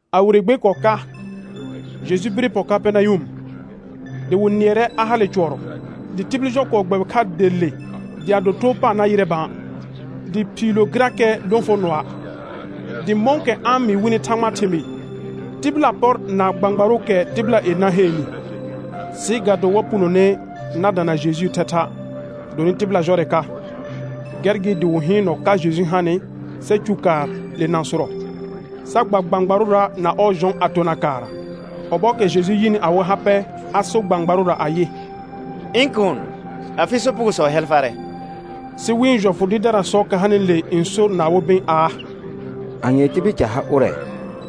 A wire gbe kɔɔ ka, Jeju bire pɔ Kapɛrnayʋm, dɩ wɩ nɩɛrɛ a hale cʋɔrɔ. Dɩ tibil jɔ kɔɔ gbɛbɩ kha der le dɩ a do too paar na yɩrɛ bã, dɩ phiilo gɩrakɛ lõfonɔa'. Dɩ mɔ̃kɛ a-n mɩɩ wɩnɩ Thãgbaa thɩmɩɩ, tɩbɩla pɔr na gbãgbaʋʋkɛ tɩbɩla yenã heennɩ. Sɩ ga do wa punone na dana Jejuu thɛtha', gɩdonɩ tɩbɩla jɔrɛ ka, gɛr gɩ dɩ wɩ hɩɩnɔ ka Jeju hanɩ sa cu kaar le nãsʋrɔ, sa gba gbãgbarʋra na ɔɔ jɔ̃ a tona kaarra. Ɔbɔɔkɛ Jeju yɩnɩ awɩ ha pɛ, a sor gbãgbarʋra ayɩ: Ɩ̃ kuun, afɩ sopugosɔ hɛl farɛ. Sɩ wɩ̃ jɔfʋ dɩɩrdarasɔɔkɛ hanɩle n sor na awɩ bɩ̃ aa: Anyee tibil ca ha ʋrɛ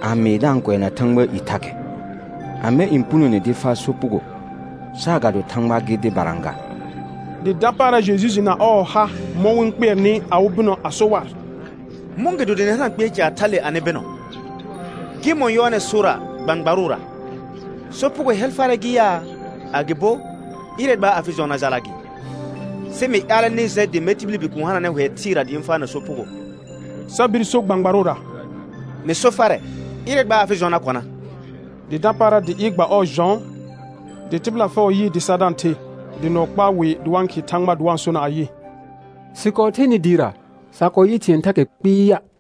a mɩɩ da-n kʋɛna Thãgbaa i thakɛ? Amɛ n punone dɩ faa sopugo saagado Thãgba gɩ dɩbara ga? Dɩ dapaara Jeju jɩ na ɔɔ ha mɔ̃ wɩ-n kpɩɛrnɩ awɩ bɩnɔ a so war: Mɔ̃gɩdo dɩ nɩ hana kpɩɛr caar thale anɩ bɩnɔ? Gɩmɔ̃ yɔɔnɛ sorra gbãgbarʋra: Sopugo hɛl farɛ gɩ yaa, agɩbo: Ɩrɛ, gba afɩ jɔ̃ na jala gɩ? Sɩ mɩ ƴaalɛ nɩ jɛ dɩ mɛr tibili Bikuun hananɛ hʋɛ thɩɩra dɩ ɩ̃ faana sopugo, sa bir so gbãgbarʋra: Mɩ so farɛ, ɩrɛ gba afɩ jɔ̃ na kɔna. Dɩ dapaara dɩ ɩɩr gba ɔɔ jɔ̃, dɩ tɩbɩla fɛʋ yɩɩ dɩ sa da-n the, dɩ nʋɔ kpaa wɩ dɩ wa-n khɩɩ Thãgba dɩ wa-n sona ayɩ: Sɩ kɔɔ thenɩ dɩɩra, sa kɔɔ yɩ thɩ̃ɛ thakɛ kpɩɩa'.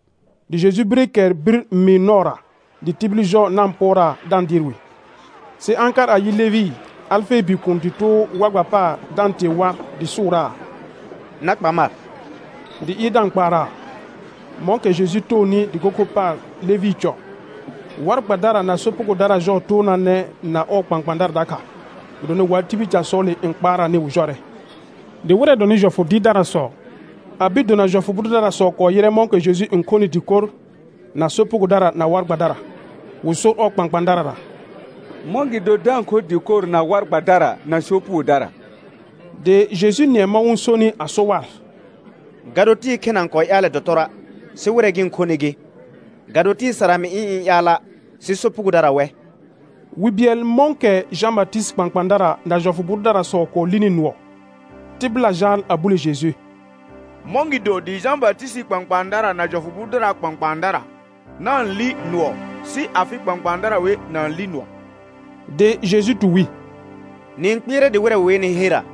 Dɩ Jeju bire kɛr bir mɩɩr nɔɔra, dɩ tibil jɔ na-n pʋɔraa da-n dɩɩr wɩ. Sɩ a-n kar a yɩ Levɩ, Alfee bikuun dɩ too war gba paar da-n tee war, dɩ sʋʋraa: Na kpa mar; dɩ ɩɩr da-n kpaaraa. Mɔ̃kɛ Jeju toonɩ dɩko kho paar Levɩɩ cɔ, war gbadara na sopugodara jɔɔ toonaanɛ na ɔɔ kpãkpãadara dakha, gɩdonɩ wa tibil casɔɔle n kpaaraanɩ wɩ jɔrɛ. Dɩ wɩrɛ dɔnɩ jɔfʋ dɩɩrdarasɔ a bir dona jɔfʋ bʋ dʋdarasɔ kɔɔ yɩrɛ mɔ̃kɛ Jeju n khonɩ dɩkor na sopugodara na war gbadara, wɩ sor ɔɔ kpãkpãadarara: Mɔ̃gɩdo da-n kho dɩkor na war gbadara na sopugodara? Dɩ Jeju nɩɛ mɔ̃ wɩ-n sonɩ a so war: Ga do tɩɩ khena n kɔɔ ƴaalɛ dɔtɔrɔa', sɩ wɩrɛ gɩ-n khonɩ gɩ. Ga do tɩɩ sara mɩ ɩ̃ ɩ̃ ƴaala', sɩ sopugodara wɛ. Wi bɩɛl mɔ̃kɛ Jã Batɩsɩtɩɩ kpãkpãadara na jɔfʋ bʋ dʋdarasɔ kɔɔ lini nʋɔ, tɩbɩla jaal a bule Jeju: Mɔ̃gɩdo dɩ Jã Batɩsɩtɩɩ kpãkpãadara na jɔfʋ bʋ dʋdaraa kpãkpãadara na-n li nʋɔ, sɩ afɩ kpãkpãadara wer na-n li nʋɔa'. Dɩ Jeju tu wi: Nɩ-n kpɩɛrɛ dɩ wɩrɛ wɩ wenɩ herra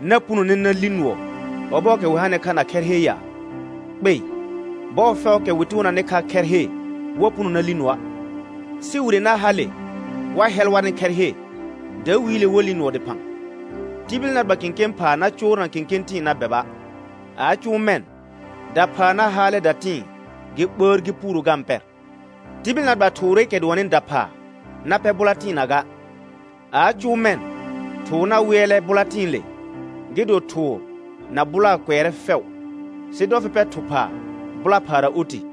na punone na li nʋɔ ɔbɔɔkɛ wɩ hanɩ kha na khɛr he ya? Kpei. Bɔɔ fɛʋʋkɛ wɩ toonanɩ kha khɛr he wa puno na li nʋɔa'. Sɩ wire na hale wa hɛl warnɩ khɛr he, dawiile wa li nʋɔ dɩphã. Tibil na gba kẽkẽ phaa na coorna kẽkẽ tɩ̃ɩ na bɛba'. A a cʋʋ mɛ̃, daphaa na-n haalɛ datɩ̃ɩ gɩ ɓəər gɩ puuro ga-n pɛr. Tibil na gba thʋʋrɩkɛ dʋɔnnɩ daphaa na pɛr bʋla tɩɩna ga. A a cʋʋ mɛ̃ thʋʋr na wɩɛlɛ bʋla tɩ̃ɩle, gɩ do thʋʋr na bʋlaa kʋɛrɛ fɛʋ, sɩ dɔ fɩ pɛ thʋ phaa bʋla phaara oti.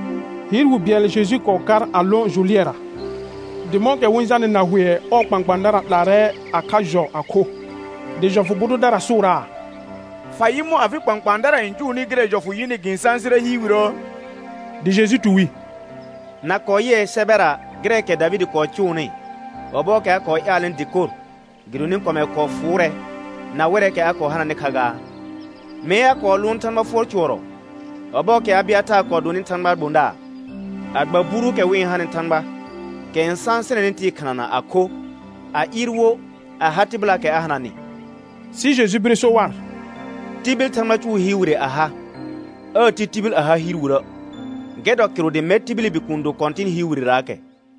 Hɩɩr wi bɩɛl Jeju n kɔɔ kar a lõ jʋ lɩɛra, dɩ mɔ̃kɛ wɩ-n jalnɩ na hʋɛ ɔɔ kpãkpãadara 'laarɛ a kha jɔ a kho. Dɩ jɔfʋ bʋ dʋdara sʋʋraa: Fa yɩ mɔ̃ afɩ kpãkpãadara n cʋʋnɩ gɩrɛ jɔfʋ yɩnɩ gɩ-n sãsɩrɛ hɩɩr wirəə? Dɩ Jeju tu wi: Na kɔɔ yɩɛ sɛbɛra gɩrɛɛkɛ Davɩdɩ kɔɔ cʋʋnɩ, ɔbɔɔkɛ a kɔɔ ƴaalnɩ dɩkor gɩdonɩ kɔmɛr kɔɔ fʋʋrɛ na wɩrɛɛkɛ a kɔɔ hananɩ kha gaa? Mee a kɔɔ lʋʋn Thãgba fʋɔr cʋɔrɔ ɔbɔɔkɛ Abɩataar kɔɔ donɩ Thãgbaa gbõdaar, a gba buruukɛ wɩ-n hanɩ Thãgba kɛ n sãsɩnɛnɩ tɩɩ khɩnana a kho, a ɩɩr wo a ha tɩbɩlaakɛ a hananɩ. Sɩ Jeju bire so war: Tibil Thãgba cʋʋ hɩɩr wire a ha, aa ti tibil a ha hɩɩr wirə'. Gɛr dɔ kɩrʋ dɩ mɛr tibili Bikuun do Kɔ̃tɩn hɩɩr wirerarakɛ.